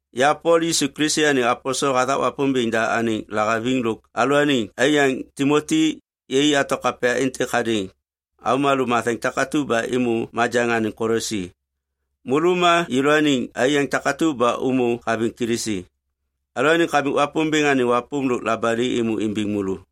Ya Pol, Yisu Kilisi anêŋ aposel hathak Wapômbêŋ da anêŋ lahaviŋ lôk alalôaniŋ aiyaŋ Timoti, yai ato kapya êntêk hadêŋ avômalô matheŋ takatu ba êmô majaŋ anêŋ Kolosi. Môlô ma yêlôaniŋ aiyaŋ takatu ba ômô haviŋ Kilisi. Alalôaniŋ Kamik Wapômbêŋ anêŋ wapôm lôk labali êmô imbiŋ môlô.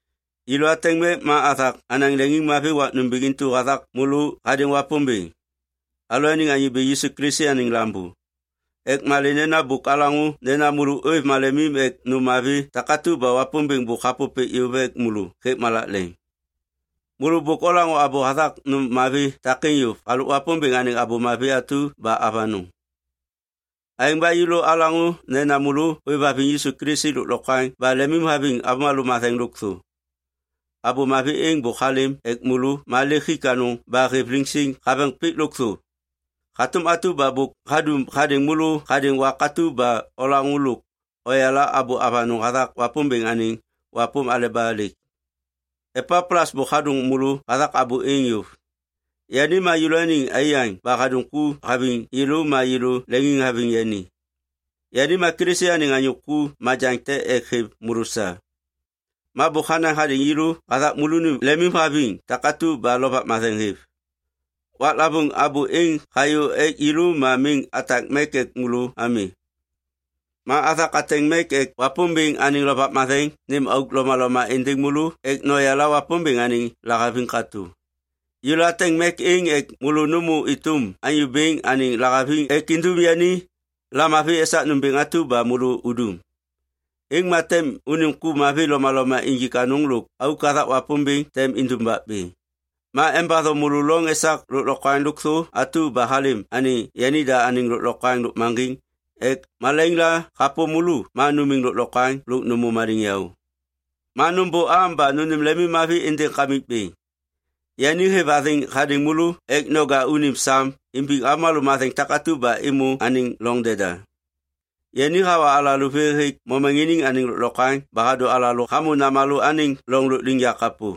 Yêlô ateŋ mek ma athak anaŋ leŋiŋmavi wak nômbêŋ intu hathak môlô hadêŋ Wapômbêŋ, alalôaniŋ Anyô Bêŋ Yisu Kilisi anêŋ Lambô ek malê nena bôk alaŋô nena môlô ôêv malemim ek nôm mavi takatu ba Wapômbêŋ bôk hapôpêk yôv ek môlô hêk malak leŋ. Môlô bôk olaŋô abô hathak nôm mavi takêŋ yôv halôk Wapômbêŋ anêŋ Abô Mavi atu ba avanôŋ. Aêŋ ba yêlô alaŋô nena môlô ôêvhaviŋ Yisu Kilisi lôklokwaŋ ba lemimhaviŋ avômalô matheŋ lôkthô. Abô Mavi êŋ bôk halêm ek môlô ma lêk hik anôŋ ba hêv liŋsiŋ haveŋ pik lôkthô. Hatôm atu ba bôk hadum hadêŋ môlô hadêŋ wak atu ba olaŋô lôk oyala abô avanôŋ hathak Wapômbêŋ anêŋ wapôm aleba lêk. Epaplas bôk hadôŋ môlô hathak abô êŋ yôv. Yani ma yêlôaniŋ aiyaŋ ba hadum ku haviŋ yêlô ma yêlô leŋiŋhaviŋ yani. Yani ma Kilisi anêŋ anyô ku majaŋ te ek hêv môlô sa. Ma bôk hanaŋ hadêŋ yêlô hathak môlônim lemimhaviŋ takatu ba Lovak Matheŋ hêv. Waklavôŋ abô êŋ hayô ek yêlô ma miŋ atak mek ek môlô ami. Ma athak ateŋ mek ek Wapômbêŋ anêŋ Lovak Matheŋ nêm auk lomaloma êndêŋ môlô ek noyala Wapômbêŋ anêŋ lahaviŋ katô. Yêlô ateŋ mek êŋ ek môlô nômô êtôm Anyô Bêŋ anêŋ lahaviŋ ek indum yani lamavi esak nômbêŋ atu ba môlô udum. Êŋ ma tem unim ku mavi lomaloma injik anôŋ lôk auk hathak Wapômbêŋ tem indumbak bêŋ. Ma embatho môlô loŋ esak lôklokwaŋ lôkthô atu ba halêm anêŋ yanida anêŋ lôklokwaŋ lôkmaŋgiŋ ek malaiŋ la hapôm môlô, ma numiŋ lôklokwaŋ lôk nômô maliŋyaô. Ma nômbôam ba nônêm lemimmavi êndêŋ Kamikbêŋ. Yani hêv athêŋ hadêŋ môlô ek noja unim sam imbiŋ avômalô matheŋ takatu ba êmô anêŋ loŋ deda. Yani hawa alalô vê hêk momaŋiniŋ anêŋ lôklokwaŋ ba hadô alalô hamô Namalô anêŋ loŋ lôkliŋyak kapô.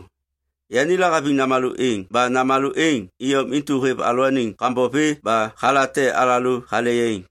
Yani lahaviŋ Namalô êŋ ba Namalô êŋ iyom intu hêv alalôaniŋ kambom vê ba halate alalô hale yaiŋ.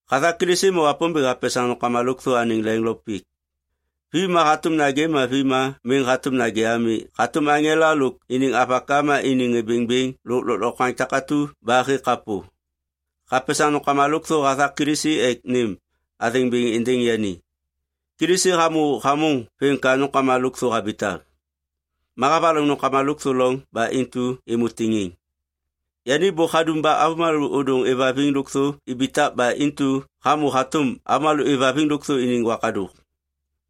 Hathak Kilisi ma Wapômbêŋ hapesaŋ nômkama lôkthô anêŋ leŋ lo pik, vi ma hatôm nagê ma vi ma miŋ hatôm nagê ami hatôm aŋela lôk iniŋ avaka ma iniŋ ŋê bêŋbêŋ lôk lôklokwaŋ takatu ba hêk kapô. Hapesaŋ nômkama lôkthô hathak Kilisi ek nêm athêŋ bêŋ êndêŋ yani. Kilisi hamô hamôŋ vêm ka nômkama lôkthô habitak. Ma havaloŋ nômkama lôkthô loŋ ba intu êmô tiŋiŋ. Yani bôk hadum ba avômalô ôdôŋ êvhaviŋ lôkthô ibitak ba intu hamô hatôm avômalô êvhaviŋ lôkthô iniŋ wakadôk.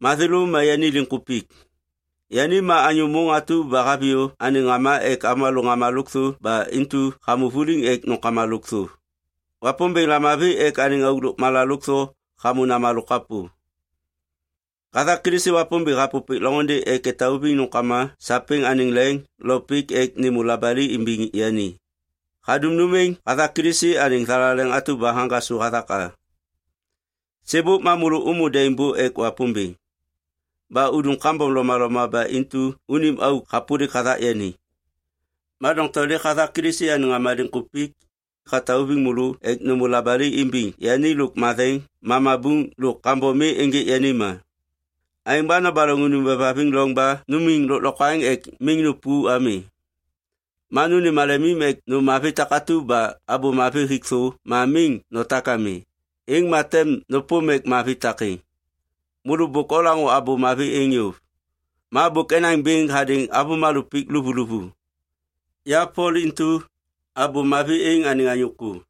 Ma thêlô ma yani liŋkupik. Yani ma anyô môŋ atu ba haviyô anêŋ ŋama ek avômalô ŋama lôkthô ba intu hamô vuliŋ ek nômkama lôkthô. Wapômbêŋ lamavi ek anêŋ auk lôkmala lôkthô hamô Namalô kapô. Hathak Kilisi Wapômbêŋ hapôpêk loŋôndê ek etauviŋ nômkama sapêŋ anêŋ leŋ lo pik ek nêmô labali imbiŋ yani. Hadum nôm êŋ hathak Kilisi anêŋ thalaleŋ atu ba haŋgasô hathak a. Sêbôk ma môlô ômô daimbô ek Wapômbêŋ. Ba udum kambom lomaloma ba intu unim auk hapôlik hathak yani. Ma doŋtom lêk hathak Kilisi anêŋ ŋama liŋkupik, hatauviŋ môlô ek nômô labali imbiŋ yani lôk matheŋ ma mabuŋ lôk kambom mi ênjêk yani ma. Aêŋ ba nobaloŋ unim ôêvhaviŋ loŋ ba numiŋ lôklokwaŋ ek miŋ nupu ami. Ma nônêm malemim ek nôm mavi takatu ba Abô Mavi hik thô ma miŋ notak ami, êŋ ma tem nôpôm mek mavi takêŋ. Môlô bôk olaŋô Abô Mavi êŋ yôv. Ma bôk enaŋ bêŋ hadêŋ avômalô pik luvuluvu. Ya Pol intu, Abô Mavi êŋ anêŋ anyô ku.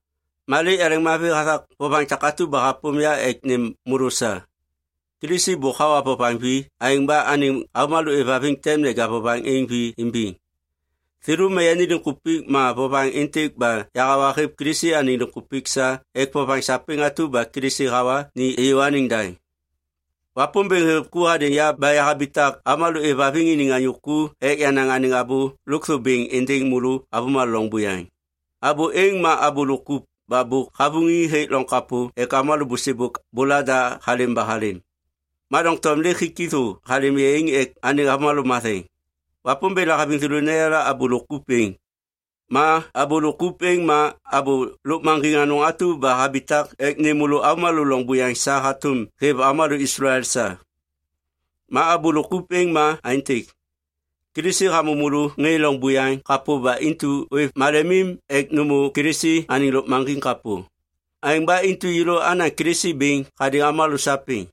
Ma lêk yaleŋmavi hathak vovaŋ takatu ba hapôm ya ek nêm môlô sa. Kilisi bôk hawa vovaŋ vi, aêŋ ba anêŋ avômalô êvhaviŋ tem neja vovaŋ êŋ vi imbiŋ. Thêlô ma yani liŋkupik ma vovaŋ êntêk ba yahawa hêv Kilisi anêŋ liŋkupik sa ek vovaŋ sapêŋ atu ba Kilisi hawa ni êyô anêŋ daŋ. Wapômbêŋ hêv ku hadêŋ ya ba yahabitak avômalô êvhaviŋ iniŋ anyô ku ek yanaŋ anêŋ abô lôkthô bêŋ êndêŋ môlô avômalô loŋ buyaŋ. Abô êŋ ma abô lôk kup ba bôk havuŋi hêk loŋ kapô ek avômalô bôsêbôk bôlada halêm ba halêm. Ma doŋtom lêk hik thô halêm yaiŋ ek anêŋ avômalô matheŋ. Wapômbêŋ lahaviŋ thêlô neyala abô lôk kup êŋ. Ma abô lôk kup êŋ ma abô lôkmaŋgiŋ anôŋ atu ba habitak ek nêm môlô avômalô loŋ buyaŋ sa hatôm hêv avômalô Islael sa. Ma abô lôk kup êŋ ma aêntêk. Kilisi hamô môlô ŋê loŋ buyaŋ kapô ba intu ôêv malemim ek nômô Kilisi anêŋ lôkmaŋgiŋ kapô. Aêŋ ba intu yêlô anaŋ Kilisi bêŋ hadêŋ avômalô sapêŋ.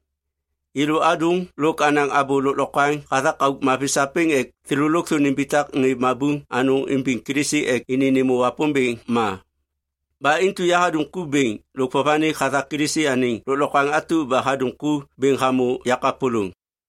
Yêlô adôŋ lôk anaŋ abô lôklokwaŋ hathak auk mavi sapêŋ ek thêlô lôkthô nimbitak ŋê mabuŋ anôŋ imbiŋ Kilisi ek ini nêmô Wapômbêŋ ma. Ba intu yahadum ku bêŋ lôk vovanik hathak Kilisi anêŋ lôklokwaŋ atu ba hadum ku bêŋ hamô yakapôlôŋ.